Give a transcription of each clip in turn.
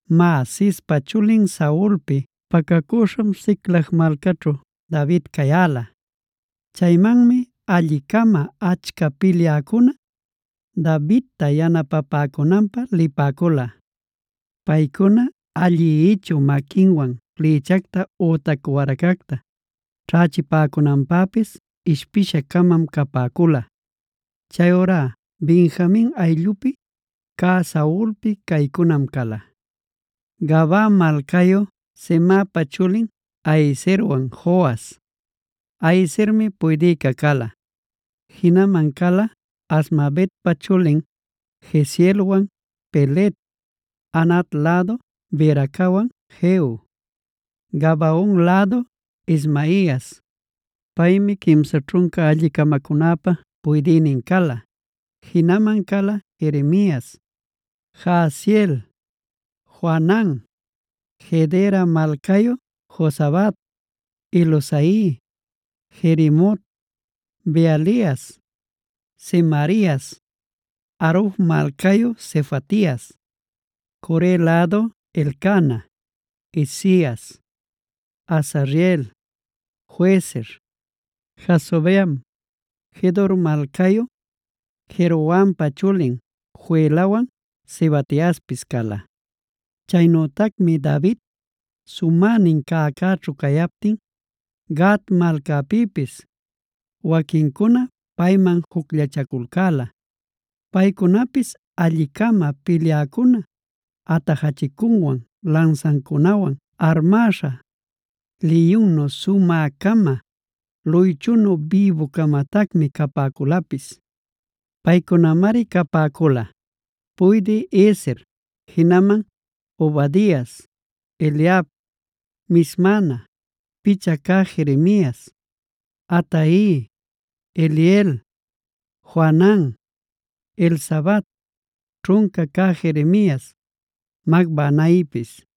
Má, Cispa chulin Saulpi pacacüśham Siclag malcaćhu David cayäla. Chaymanmi alli-cama achca pilyäcuna Davidta yanapapäcunanpä lipäcula. Paycuna allï-ichü maquinwan flïchacta ütac waracacta ćhächipäcunanpäpis ishpisha-camam capäcula. Chayurá Benjamin ayllupi cä Saulpi caycunam cala: Gabaa malcayu Semaapa chulin Ahiezerwan Joas. (Ahiezermi puydïca cala.) Jinaman cala Azmavetpa chulin Jezielwan Pelet, Anat lädu Beracawan Jehu, Gabaon lädu Ismaias. Paymi quimsa ćhunca alli-camacunäpa puydïnin cala. Jinaman cala Jeremias, Jahaziel, Johanan, Gedera malcayu Jozabad, Eluzai, Jerimot, Bealias, Semarias, Haruf malcayu Sefatias, Core lädu Elcana, Isias, Azareel, Joezer, Jasobeam, Gedor malcayu Jerohampa chulin Joelawan Zebadiaspis cala. Chaynütacmi David sumänin cäcäćhu cayaptin Gad malcapïpis waquincuna payman jucllachaculcäla. Paycunapis alli-cama pilyäcuna, atajachicuwan lansancunawan armäśha, liyunnu sumä-cama, luychunu bïbu-camatacmi capäculapis. Paycunamari capäcula: puydï Ezer, jinaman Obadias, Eliab, Mismana, picha cä Jeremias, Atai, Eliel, Johanan, Elzabad, ćhunca cä Jeremias, Macbanaipis.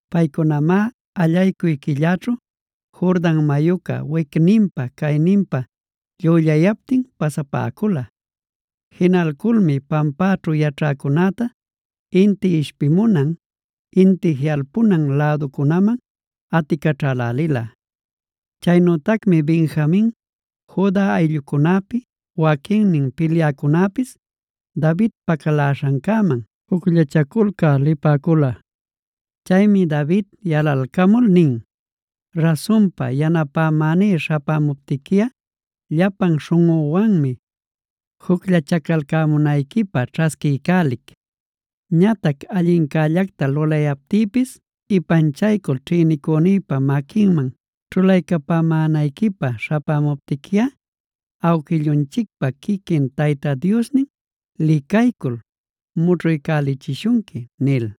Paycunamá allaycuy quillaćhu Jordan mayuca wicninpa cayninpa llüllayaptin pasapäcula. Jinalculmi pampaćhu yaćhäcunäta inti ishpimunan, inti jiꞌalpunan läducunaman aticaćhälälila. Chaynütacmi Benjamin, Juda ayllucunapi waquinnin pilyäcunapis David pacaläśhancäman jucllachaculcä lipäcula. Chaymi David yalalcamul nin: “Rasunpa yanapäní śhapämuptiquiꞌa llapan śhunꞌüwanmi jucllachacalcämunayquipä ćhasquiycälic. Ñatac allincällacta lulayaptïpis ipanchalcul ćhïnicünïpa maquinman ćhulaycapämänayquipä śhapämuptiquiꞌa ¡awquillunchicpa quiquin Tayta Diosnin licaycul mućhuycälichishunqui!” nil.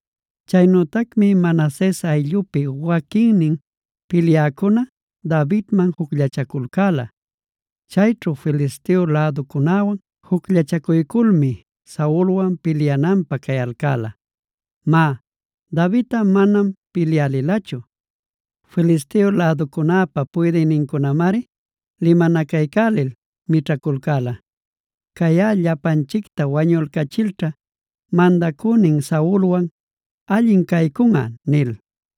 Chaynütacmi Manases ayllupi waquinnin pilyäcuna Davidman jucllachaculcäla; chayćhu Filisteo läducunäwan jucllachacuyculmi Saulwan pilyananpä cayalcäla. (Má, Davidꞌa manam pilyä lilachu. Filisteo läducunäpa puydïnincunamari limanacaycälil mićhaculcäla: “Cayꞌa llapanchicta wañulcachilćha mandacünin Saulwan allin caycunꞌa” nil.)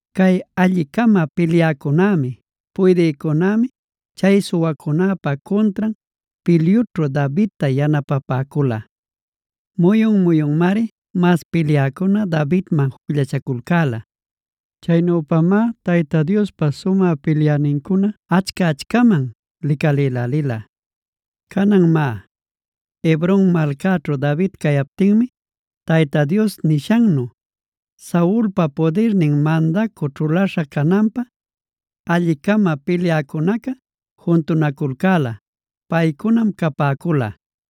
Cay alli-cama pilyäcunämi, puydïcunämi chay suwacunäpa cuntran pilyućhu Davidta yanapapäcula. Muyun-muyunmari mas pilyäcuna Davidman jucllachaculcäla. Chaynüpamá Tayta Diospa sumä pilyänincuna achca-achcaman licalïlälila. Canan má, Hebron malcaćhu David cayaptinmi Tayta Dios nishannu, Saulpa pudirnin mandacü ćhulaśha cananpä, alli-cama pilyäcunaca juntunaculcäla. Paycunam capäcula: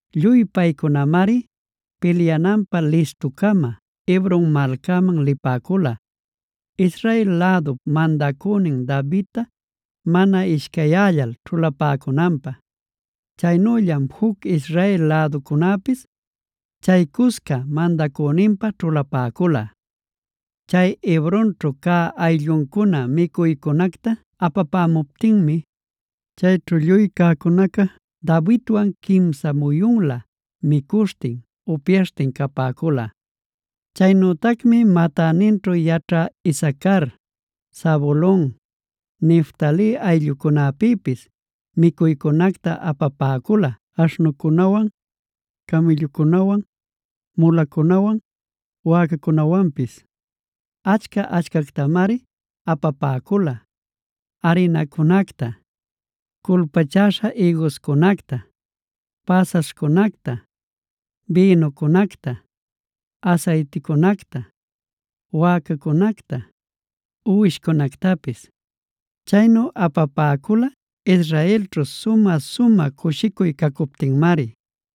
Lluy paycunamari pilyananpä listu-cama Hebron malcaman lipäcula, Israel lädup mandäninpa Davidta mana ishcayyällal ćhulapäcunanpä. Chaynüllam juc Israel läducunäpis chaycusca mandacüninpä ćhulapäcula. Chay Hebronćhu cä aylluncuna micuycunacta apapämuptinmi, chayćhu lluy cäcunaca Davidwan quimsa muyunlä micuśhtin upyaśhtin capäcula. Chaynütacmi matäninćhu yaćhä Isacar, Zabulon, Neftali ayllucunapïpis micuycunacta apapäcula aśhnucunawan, camïllucunawan, mulacunawan, wäcacunawanpis. Achca-achcactamari apapäcula: arinacunacta, culpachäśha ïguscunacta, päsaśhcunacta, bïnucunacta, asayticunacta, wäcacunacta, uwishcunactapis. Chaynu apapäcula Israelćhu sumä-sumä cushicuy cacuptinmari.